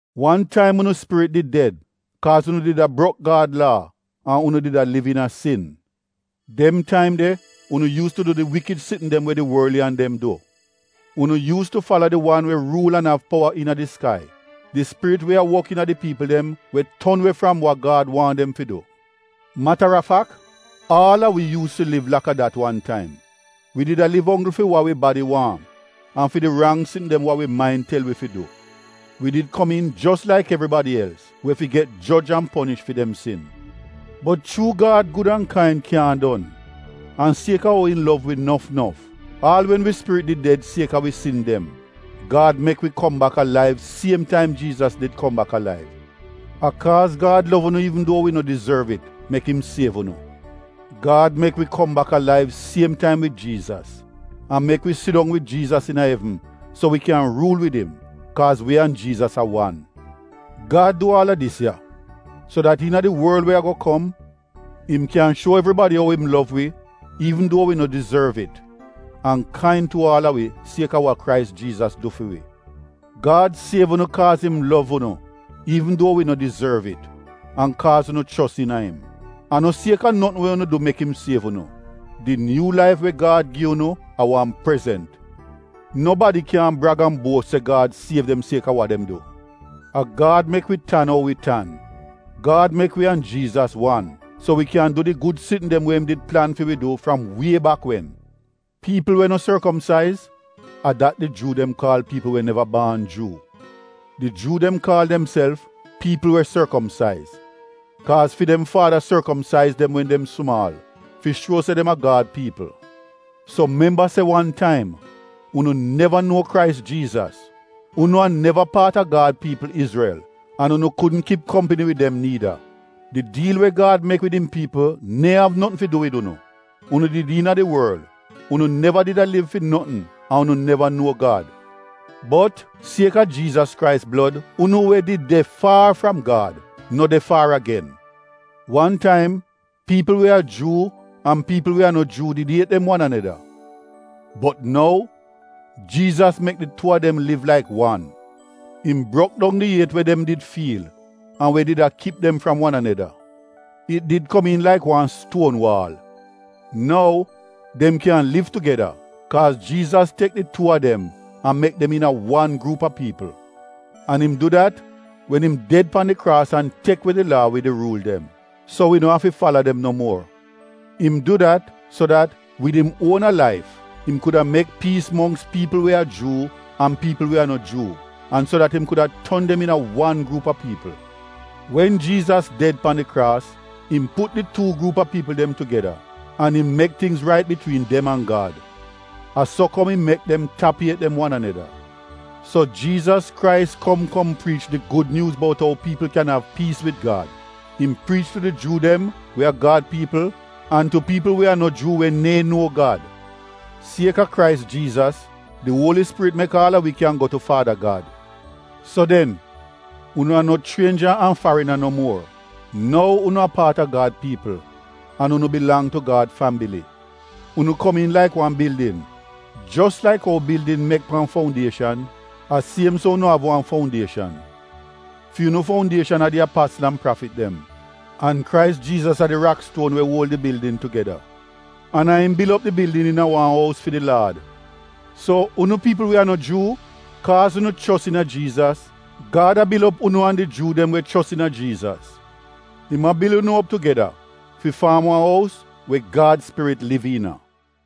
Wan taim unu spirit did ded kaaz unu did a brok Gad laa an unu did a liv iina sin. Dem taim de unu yuus tu du di wikid sitn dem we di worliyan dem du. Unu yuus tu fala di wan we ruul an av powa iina di skai, di spirit we a wok iina di piipl dem we ton we fram wa Gad waahn dem fi du. Mata a fak, aal a wi yuus tu liv laka dat wan taim. Wi did a liv onggl fi wa wi badi waahn an fi di rang sitn dem wa wi main tel wi fi du. Wi did komiin jos laik evribadi els we fi get joj an ponish fi dem sin. Bot chuu Gad gud an kain kyaahn don an sieka ou im lov wi nof nof, aal wen wi spirit did ded sieka wi sin dem, Gad mek wi kom bak alaiv siem taim Jiizas did kom bak alaiv. (A kaaz Gad gud an kain mek im siev unu.) Gad mek wi kom bak alaiv siem taim wid Jiizas, an mek wi sidong wid Jiizas iina evn so wi kyan ruul wid im, kaaz wi an Jiizas a wan. Gad du aal a dis ya, so dat iina di worl we ago kom, im kyaahn shuo evribadi ou im riili gud an kain tu aal a wi sieka wa Krais Jiizas du fi wi. Gad siev unu kaaz im gud an kain, an kaaz unu chos iina im. A no sieka notn we unu du mek im siev unu. Di nyuu laif we Gad gi unu a wan prezent. Nobadi kyaahn brag an buos se Gad siev dem sieka wa dem du. A Gad mek wi tan ou wi tan. Gad mek wi an Jiizas wan, so wi kyan du di gud sitn dem we im did plan fi wi du fram wie bak wen. “Piipl we no sorkomsaiz,” a dat di Juu dem kaal piipl we neva baan Juu. Di Juu dem kaal demself “piipl we sorkomsaiz,” kaaz fi dem faada sorkomsaiz dem wen dem sumaal, fi shuo se dem a Gad piipl. So memba se wan taim, unu neva nou Krais Jiizas, unu a neva paat a Gad piipl, Izrel an unu kudn kip kompni wid dem niida. Di diil we Gad mek wid im piipl neehn av notn fi du wid unu. Unu did iina di worl, unu neva did a liv fi notn an unu neva nuo Gad. Bot, sieka Jiizas Krais blod, unu we did de faar fram Gad no de faar agen. Wan taim, piipl we a Juu an piipl we a no Juu did iet dem wan aneda. Bot nou, Jiizas mek di tu a dem liv laik wan. Im brok dong di iet we dem did fiil an we did a kip dem fram wan aneda. It did komiin laik wan stuon waal. Nou, dem kyan liv tugeda, kaaz Jiizas tek di tuu a dem an mek dem iina wan gruup a piipl. An im du dat, wen im ded pan di kraas an tek we di Laa wid di ruul dem, so wi no afi fala dem no muor. Im du dat, so dat, wid im uona laif, im kuda mek piis mongks piipl we a Juu an piipl we a no Juu, an so dat im kuda ton dem iina wan gruup a piipl. Wen Jiizas ded pan di kraas, im put di tuu gruup a piipl dem tugeda an im mek tingz rait bitwiin dem an Gad. A so kom im mek dem tap iet dem wan aneda. So Jiizas Krais kom kom priich di Gud Nyuuz bout ou piipl kyan av piis wid Gad. Im priich tu di Juu dem we a Gad piipl an tu piipl we a no Juu we neehn nuo Gad. Sieka Krais, di Uoli Spirit mek aal a wi kyan go tu Faada Gad. So den, unu a no chrienja an farina no muor. Nou unu a paat a Gad piipl an unu bilang tu Gad fambili. Unu komiin laik wan bildin. Jos laik ou bildin mek pan foundieshan, a siem so unu av wan foundieshan. Fi unu foundieshan a di apasl an prafit dem. An Krais Jiizas a di rakstuon we uol di bildin tugeda. An a im bil op di bildin iina wan ous fi di Laad So, unu piipl we a no Juu, kaaz unu chos iina Jiizas, Gad a bil op unu an di Juu dem we chos iina Jiizas. Im a bil unu op tugeda fi faam wan ous we Gad Spirit liv iina.